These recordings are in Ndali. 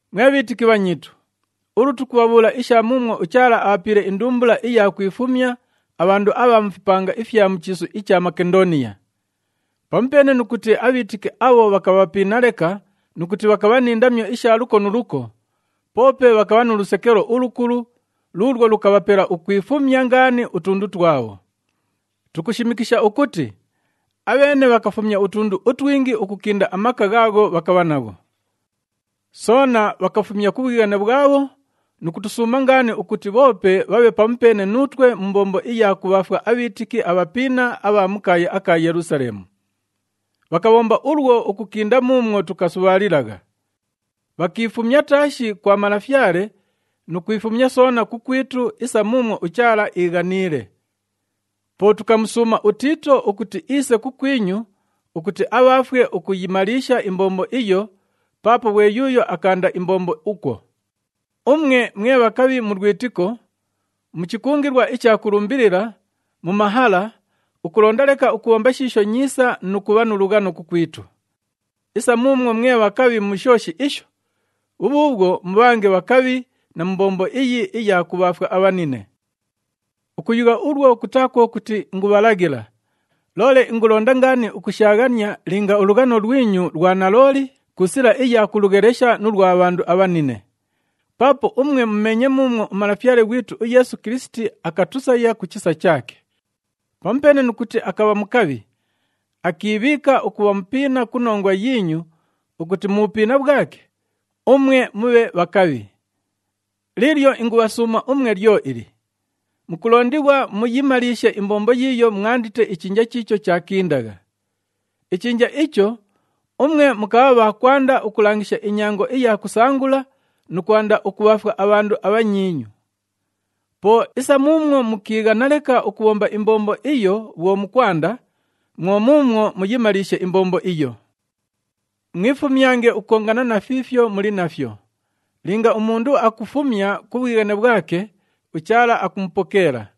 Mwe bhiitiki bhanyiitu, ulu tukubhabhuula isha muumwo uChaala abhapiile indumbula iya kwifumya abhandu abha mu fipanga ifya mu chiisu icha Makendooniya. Pamupeene nu kuti abhiitiki abho bhakabha bhapiina leka nu kuti bhakabha ni ndamyo isha luko nu luko, poope bhakabha nu lusekelo ulukulu luulwo lukabhapela ukwifumya ngaani utundu twabho. Tukushimikisha ukuti, abheene bhakafumya utundu utwingi ukukinda amaka ghaagho bhakabha nagho. Soona bhakafumya ku bhwighane bhwabho nu kutusuuma ngaani ukuti bhoope bhabhe pamupeene nuutwe mu mbombo iya kubhaafwa abhiitiki abhapiina abha mu kaaya aka Yelusaleemu. Bhakabhomba ulwo ukukinda muumwo tukasubhaalilagha. Bhakiifumya taashi kwa Malafyale nu kwifumya soona kukwitu isa muumwo uChaala iighaniile. Po tukamusuuma uTiito ukuti iise kukwinyu ukuti abhaafwe ukuyimaliisha imbombo iyo, paapo ghwe yuuyo akaanda imbombo ukwo. Umwe mwe bhakabhi mu lwitiko, mu chikungilwa icha kulumbilila, mu mahala, ukulonda leka ukubhomba shiisho nyiisa nu kubha nu lughano kukwitu. Isa muumwo mwe bhakabhi mu shooshi isho, bhubhuubhwo mubhange bhakabhi na mu mbombo iyi iya kubhaafwa abhanine. Ukuyugha ulwo kutaa kwo kuti ingubhalaghila, loole ingulonda ngaani ukushaaghania linga ulughano lwinyu lwa nalooli ku sila iya kulughelesha nu lwa bhandu abhanine. Paapo umwe mumeenye muumwo uMalafyale ghwitu uYeesu Kilisiti akatusaya ku chisa chaake. Pamupeene nu kuti akabha mukabhi, akiibhiika ukubha mupiina ku nongwa yiinyu ukuti mu bhupiina bhwake, umwe mubhe bhakabhi. Liilyo ingubhasuuma umwe lyo ili, mukulondighwa muyimaliishe imbombo yiiyo mwandite ichinja chiicho chaakindagha. Ichinja icho, umwe mukabha bha kwanda ukulangisha inyango iya kusangula nu kwanda ukubhaafwa abhandu abhanyiinyu. Po isa muumwo mukiighana leka ukubhomba imbombo iyo bhwo mukwanda, mwo muumwo muyimaliishe imbombo iyo. Mwifumyange ukukongana na fiifyo muli nafyo. Linga umundu akufumya ku bhwighane bhwake, uChaala akumupokeela.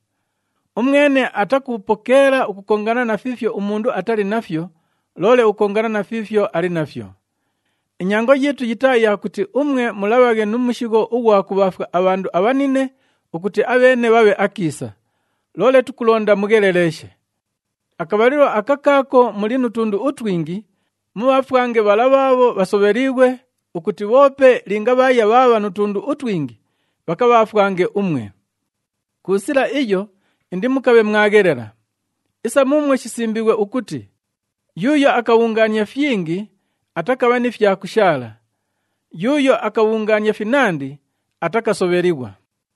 Umwene atakupokeela ukukongana na fiifyo umundu atali nafyo, loole ukukongana na fiifyo ali nafyo. Inyango yiitu yitaa ya kuti umwe mulabhaghe nu mushigho ughwa kubhaafwa abhandu abhanine ukuti abheene bhabhe akiisa, loole tukulonda mugheleleeshe. Akabhalilo aka kaako muli nu tundu utwingi, mubhaafwange bhala bhaabho bhasobheliighwe ukuti bhoope linga bhaaya bhaabha nu tundu utwingi, bhakabhaafwange umwe. Ku sila iyo indimukabhe mwaghelela. Isa muumwo shisimbiighwe ukuti, “Yuuyo akabhungaania fyingi, atakabha ni fya kushaala, yuuyo akabhungaania finandi, atakasobhelighwa.”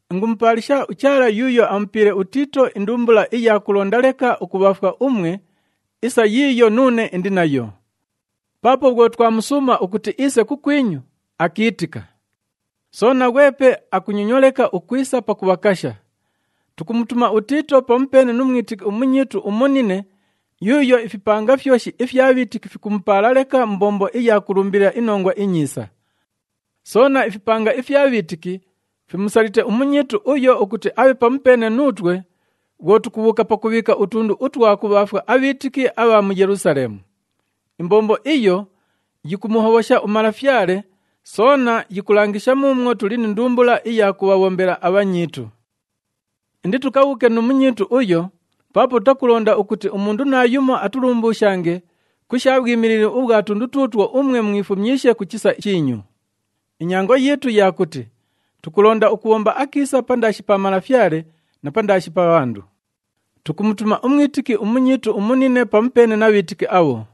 Ingumupaalisha uChaala yuuyo amupiile uTiito indumbula iya kulonda leka ukubhaafwa umwe isa yiiyo nuune indi nayo. Paapo bhwo twamusuuma ukuti iise kukwinyu, akiitika. Soona, ghwepe akunyonywa leka ukwisa pakubhakasha. Tukumutuma uTiito pamupeene nu mwitiki umunyiitu umunine yuuyo ifipanga fyoshi ifya bhiitiki fikumupaala leka mu mbombo iya kulumbilila iNongwa iNyiisa. Soona, ifipanga ifya bhiitiki fimusalite umunyiitu uyo ukuti abhe pamupeene nuutwe bhwo tukubhuuka pakubhiika utundu utwa kubhaafwa abhiitiki abha mu Yelusaleemu. Imbombo iyo yikumuhobhosha uMalafyale, soona yikulangisha muumwo tuli ni ndumbula iya kubhabhombela abhanyiitu. Inditukabhuuke nu munyiitu uyo, paapo tutakulonda ukuti umundu naayumo atulumbuushange ku sha bhwimilili ubhwa tundu tuutwo umwe mwifumyishe ku chisa chiinyu. Inyango yiitu ya kuti tukulonda ukubhomba akiisa pandaashi pa Malafyale na pandaashi pa bhandu. Tukumutuma umwitiki umunyiitu umunine pamupeene na bhiitiki abho.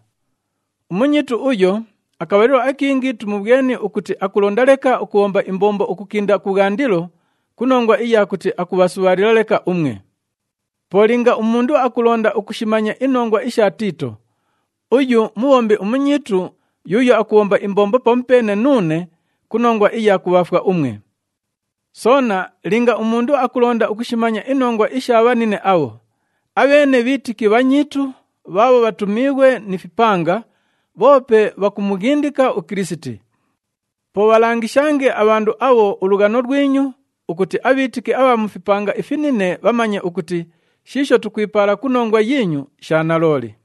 Umunyiitu uyo, akabhalilo akingi tumubhweni ukuti akulonda leka ukubhomba imbombo ukukinda kubhwandilo ku nongwa iya kuti akubhasubhaalila leka umwe. Po linga umundu akulonda ukushimanya inongwa isha Tiito, uyu mubhombi munyiitu yuuyo akubhomba imbombo pamupeene nuune ku nongwa iya kubhaafwa umwe. Soona linga umundu akulonda ukushimanya inongwa isha bhanine abho, abheene bhiitiki bhanyiitu bhaabho bhatumiighwe ni fipanga, bhoope bhakumughindika uKilisiti. Po bhalangishange abhandu abho ulughano lwinyu ukuti abhiitiki abha mu fipanga ifinine bhamanye ukuti shiisho tukwipaala ku nongwa yiinyu sha nalooli.